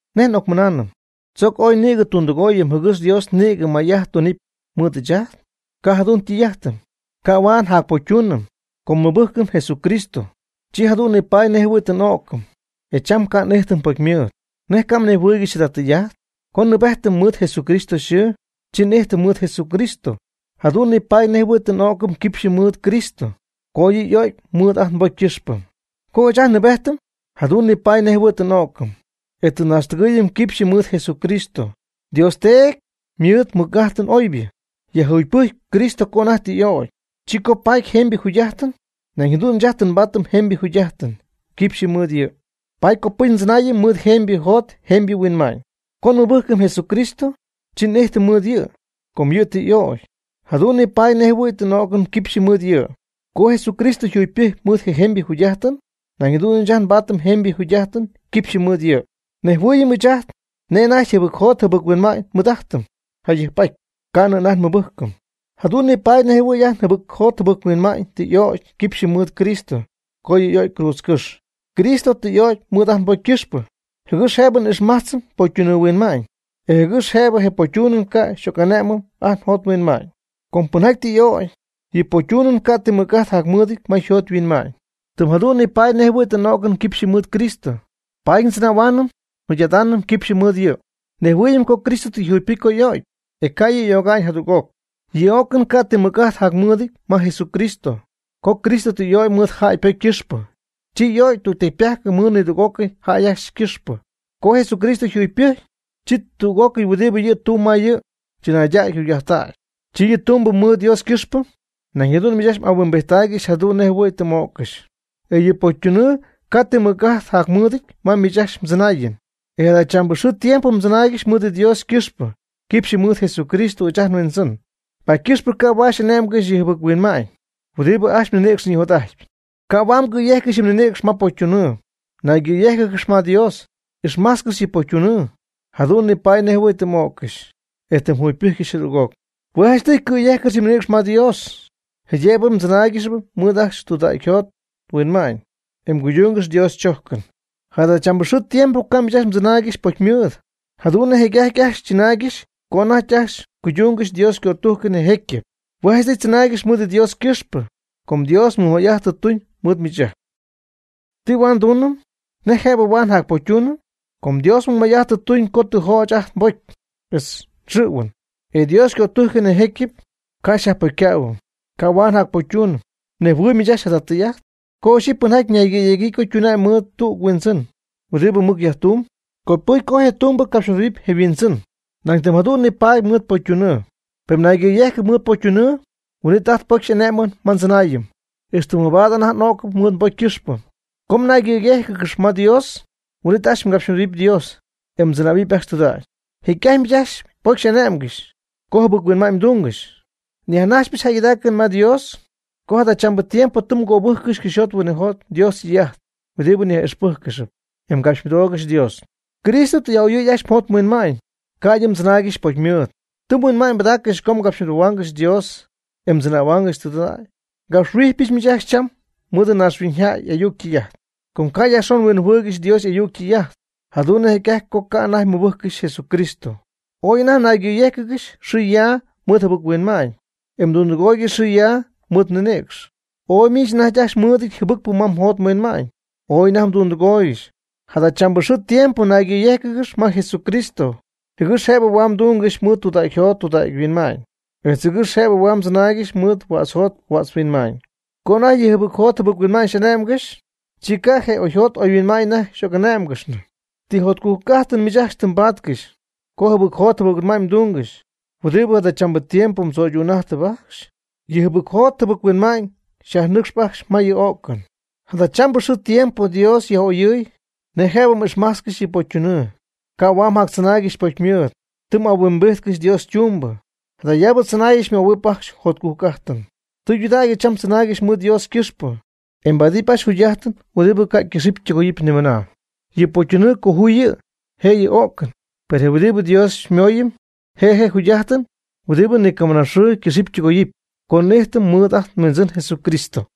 ¿Nej n'ocmɨnaanɨm? ¿Tzoc ooy nïgɨ tundɨgooyɨm jɨgɨx Dios nïgɨ may'ajt tunɨpy mɨɨd ɨɨch ajt? Ca' jadu'n ytɨy'ajtɨty, ca' huaad njacpocytuunɨm. Co nmɨbɨjcɨm Jesucristo, chi jadu'n nipaady nejɨhuɨ̈y tɨ n'o'cɨm, e cham ca' n'ijtɨm pocymɨɨd. ¿Nej ca' mnejhuɨɨygɨxy jada tɨy'ajt? Co nnɨɨbejtɨm mɨɨd Jesucristo yxɨɨ, chi n'ijtɨm mɨɨd Jesucristo. Jadu'n nipaady nej jɨhuɨ̈y tɨ n'o'cɨm quipxy mɨɨd Cristo co yɨ' y'o'cy mɨɨd ajt nbocy ycɨxpɨ. Co ɨɨch ajt nnɨɨbejtɨm jadu'n nipaady nej jɨhuɨ̈y tɨ n'o'cɨm, e tɨ nnaaxtɨgɨɨyɨm quipxyɨ mɨɨd Jesucristo. Dios Teedy mɨɨd ymɨc'ajtɨn oybɨ yajjugypɨjcy Cristo co anajty tɨ y'ögy, chi Cristo paty jemybɨ jugy'ajtɨn, nañ jadu'n ɨɨch ajt tɨ nbaatɨm jemybɨ jugy'ajtɨn quipxy mɨɨd yɨ', paady copɨcy ndzɨnaayɨm mɨɨd jemybɨ jot jemybɨ huinma'ñ. Co nmɨbɨjcɨm Jesucristo, chi n'ijtɨm mɨɨd yɨ', co yɨ' tɨ y'ögy, jadu'n nipaady nej jɨhuɨ̈y tɨ n'o'cɨm quipxy mɨɨd yɨ'. Co Jesucristo yjugypɨjcy mɨɨd jemybɨ yjugy'ajtɨn, nañ jadu'n ɨɨch ajt nbaatɨm jemybɨ jugy'ajtɨn quipxy mɨɨd yɨ'. Nejhuɨɨyɨm ɨɨch ajt nej anajty jɨbɨc-jot jɨbɨc-huinma'ñ nmɨɨd'ajtɨm jayɨjp'aty ca'nɨ anajty nmɨbɨjcɨm. Jadu'n nipaady nej jɨhuɨ̈y ajt njɨbɨcjot njɨbɨc-huinma'ñ tɨ y'ögy quipxy mɨɨd Cristo co yɨ' y'o'cy cruudzcɨ́xy. Cristo tɨ y'ögy mɨɨd ajt nbocy ycɨxpɨ, jɨgɨx jëbɨ n'ijxmajtzɨm pocytunɨɨ huinma'ñ, etz jɨgɨx jëbɨ je pocytunɨɨ ca' xyjac'ane'mɨm ajt njot nhuinma'ñ. Com pɨnjaty tɨ y'ögy, yɨ ypocytunɨɨ ca' ti mɨc'ajt jacmɨɨdɨty ma yjot yhuinma'ñ. Pen jadu'n nipaady nej jɨhuɨ̈y tɨ n'o'cɨm quipxy mɨɨd Cristo, paady ndzɨnähuaanɨm njugy'adaanɨm quipxy mɨɨd yɨ'. Nejhuɨɨyɨm co Cristo tɨ yjugypɨjcy co y'o'cy, e ca' yɨ' y'öga'ñ jadüg'oc. Yɨ o'cɨn ca' ti mɨc'ajt jacmɨɨdɨty ma Jesucristo. Co Cristo tɨ y'o'cy mɨɨd jäy ypocy ycɨxpɨ, chi y'ögy tüg tecypajc mɨɨd nidüg'ócɨy jäy ajcxy ycɨxpɨ. Co Jesucristo yjugypɨjcy, chi tüg'ócɨy huɨdibɨ yɨ' ytumyb ma yɨ' chɨnaydac yjugy'ajttac, yɨ' ytumyb mɨɨd Dios ycɨxpɨ. Nañ jadu'n miich ajcxy mhuinma'ñypɨdaaccɨx jadu'n nej jɨhuɨ̈y tɨ m'öccɨxy, e yɨ ypocytunɨɨ ca' ti mɨc'ajt jacmɨɨdɨty ma miich ajcxy mdzɨnaayɨn. E jadachambɨ xɨɨ tiempo tzɨnaaygɨx mɨɨd Dios ycɨxpɨ quipxy mɨɨd Jesucristo ɨɨch ajt nHuindzɨn. Paady ycɨxpɨ ca' huaad xy'ane'mgɨxy je jɨbɨc-huinma'ñ huɨdibɨ ajcxy mninïcx yjanijot'ajtpy. Ca' huaad mgɨ̈yejccɨxy yɨ mninïcx ma pocytunɨɨ. Naygɨ̈yéjcɨgɨx ma Dios, ixmajtzcɨx yɨ pocytunɨɨ. Jadu'n nipaady nej jɨhuɨ̈y tɨ m'öccɨxy, e tɨ mjugypɨjccɨxy jadüg'oc. Hue' janchtɨy cɨ̈yejccɨx yɨ mninïcx ma Dios, jaydëbɨ mdzɨnáaygɨxɨpy mɨɨd ajcxy tudägy mjot mhuinma'ñ, e cuydungɨx Dios chojcɨn. Jadachambɨ xɨɨ tiempo ca' miich ajcxy mdzɨnaaygɨxy pocymɨɨd, jadu'n nej jecy'ajty ajcxy mdzɨnaaygɨxy co anajty ajcxy mguydungɨxy Dios ycötujcɨn je jecyɨp. Hue' janchtɨy tzɨnaaygɨx mɨɨd Dios ycɨxpɨ, com Dios mɨj may'ajt tɨ tuñ mɨɨd miich ajcxy. ¿Ti huaad nduunɨm? ¿Nej jëbɨ huaad njacpocytuunɨm? Com Dios mɨjmay'ajt tɨ tuñ co tɨ jöch ajt nbocy etz nxɨ̈huɨn, e Dios ycötujcɨn, je jecyɨp, ca' xyjacyajpocycähuɨm. Ca' huaad njacpocytuunɨm. ¿Mnejhuɨɨyb miich ajcxy jada tɨy'ajt? Co ixyɨpy pɨnjaty ñaygɨ̈yegyii co ytuna'ñ mɨɨd tüg huindzɨn huɨdibɨ mɨc yajtumb, copɨcy co je tumbɨ capxymɨdohuɨpy je yhuindzɨn. Nañ tɨm jadu'n nipaady mɨɨd pocytunɨɨ. Pen mnaygɨ̈yejcɨp mɨɨd pocytunɨɨ, huin'it anajty pocy xy'ane'my ma mdzɨnaayɨn, ixtɨ mabaad anajty m'ögy mɨɨd mbocy ycɨxpɨ. Co mnaygɨ̈yéjcɨgɨxɨpy ma Dios, huin'it ajcxy mgapxymɨdohuɨpy Dios, e mdzɨnähuɨp ajcxy tudägy. Jecy'ajty miich ajcxy anajty pocy xy'ane'mgɨxy, co jɨbɨc-huinma'ñ mdungɨxy. Nyajnajxpyɨch jäygɨdaacɨn ma Dios co jadachambɨ tiempo tɨ mgöbɨjccɨxy cɨxyjot huinɨjot Dios ytɨy'ajt huɨdibɨ xyaj'ixpɨjccɨxp, e mgapxymɨdoogɨxy Dios. Cristo tɨ xyaj'a'oyɨɨyɨ ajcxy mjot mhuinma'ñ, ca'ydɨ mjactzɨnaaygɨxy pocymɨɨd. Tɨ mhuinma'ñ mbɨdaaccɨxy co mgapxymɨdohuaangɨxy Dios e mdzɨnähuaangɨxy tudägy. (Ngapxhuijpyɨch miich ajcxy cham mɨɨd naaxhuiñyjäy y'ayuc ytɨy'ajt, com ca' yajxon mhuinjɨhuɨɨygɨxy Dios y'ayuc ytɨy'ajt.) Jadu'n nej jecy'ajty co ca' anajty mmɨbɨjccɨxy Cristo, ooy anajty mnaygɨ̈yéjcɨgɨxy xɨɨ ya ma jɨbɨc-huinma'ñ, e mdundɨgooygɨxy xɨɨ ya mɨɨd mninïcx. Ooy miich anajty ajcxy mɨɨdɨty jɨbɨcpɨ ma mjot mhuinma'ñ, ooy anajty mdundɨgooygɨxy. Jadachambɨ xɨɨ tiempo naygɨ̈yéjcɨgɨx ma Jesucristo, jɨgɨx jëbɨ huaad mdungɨxy mɨɨd tudägy jot tudägy huinma'ñ, etz jɨgɨx jëbɨ huaad mdzɨnaaygɨxy mɨɨd huädz jot huädz huinma'ñ. Co anajty yɨ jɨbɨc jot jɨbɨc-huinma'ñ xy'ane'mgɨxy, chi ca' je oyjot oyhuinma'ñ anajty xy'oc'ané'mgɨxnɨ. ¿Ti jotcujc'ajtɨn miich ajcxy tɨ mbaatcɨxy co jɨbɨc jot jɨbɨc-huinma'ñ mdungɨxy huɨdibɨ jadachambɨ tiempo mdzöydu'n'ajtɨp ajcxy? Yɨ jɨbɨc jot jɨbɨc-huinma'ñ xyyajnɨcxp ajcxy ma yɨ o'cɨn. Jadachambɨ xɨɨ tiempo Dios tɨ yaj'oyɨ̈y nej jëbɨ m'ixmájtzcɨxɨpy yɨ pocytunɨɨ, ca' huaad mjactzɨnaaygɨxy pocymɨɨd. Tɨ m'ahuimbijtcɨxy Dios ytumbɨ, jadayaabɨ tzɨnaayɨn xymöhuɨp ajcxy mjotcujc'ajtɨn. Tɨydudägy cham tzɨnaaygɨx mɨɨd Dios ycɨxpɨ, e mbaadɨp ajcxy jugy'ajtɨn huɨdibɨ ca' ycɨxɨpy ytɨgoyɨpy nimɨna. Yɨ pocytunɨɨ ycoju'ñ yɨ' je' yɨ o'cɨn. Per je huɨdibɨ Dios xyñimooyɨm, hue' je' je jugy'ajtɨn huɨdibɨ ni camɨnaxɨɨ ycɨxɨpy ytɨgoyɨpy co n'ijtɨm mɨɨd ajt nHuindzɨn Jesucristo.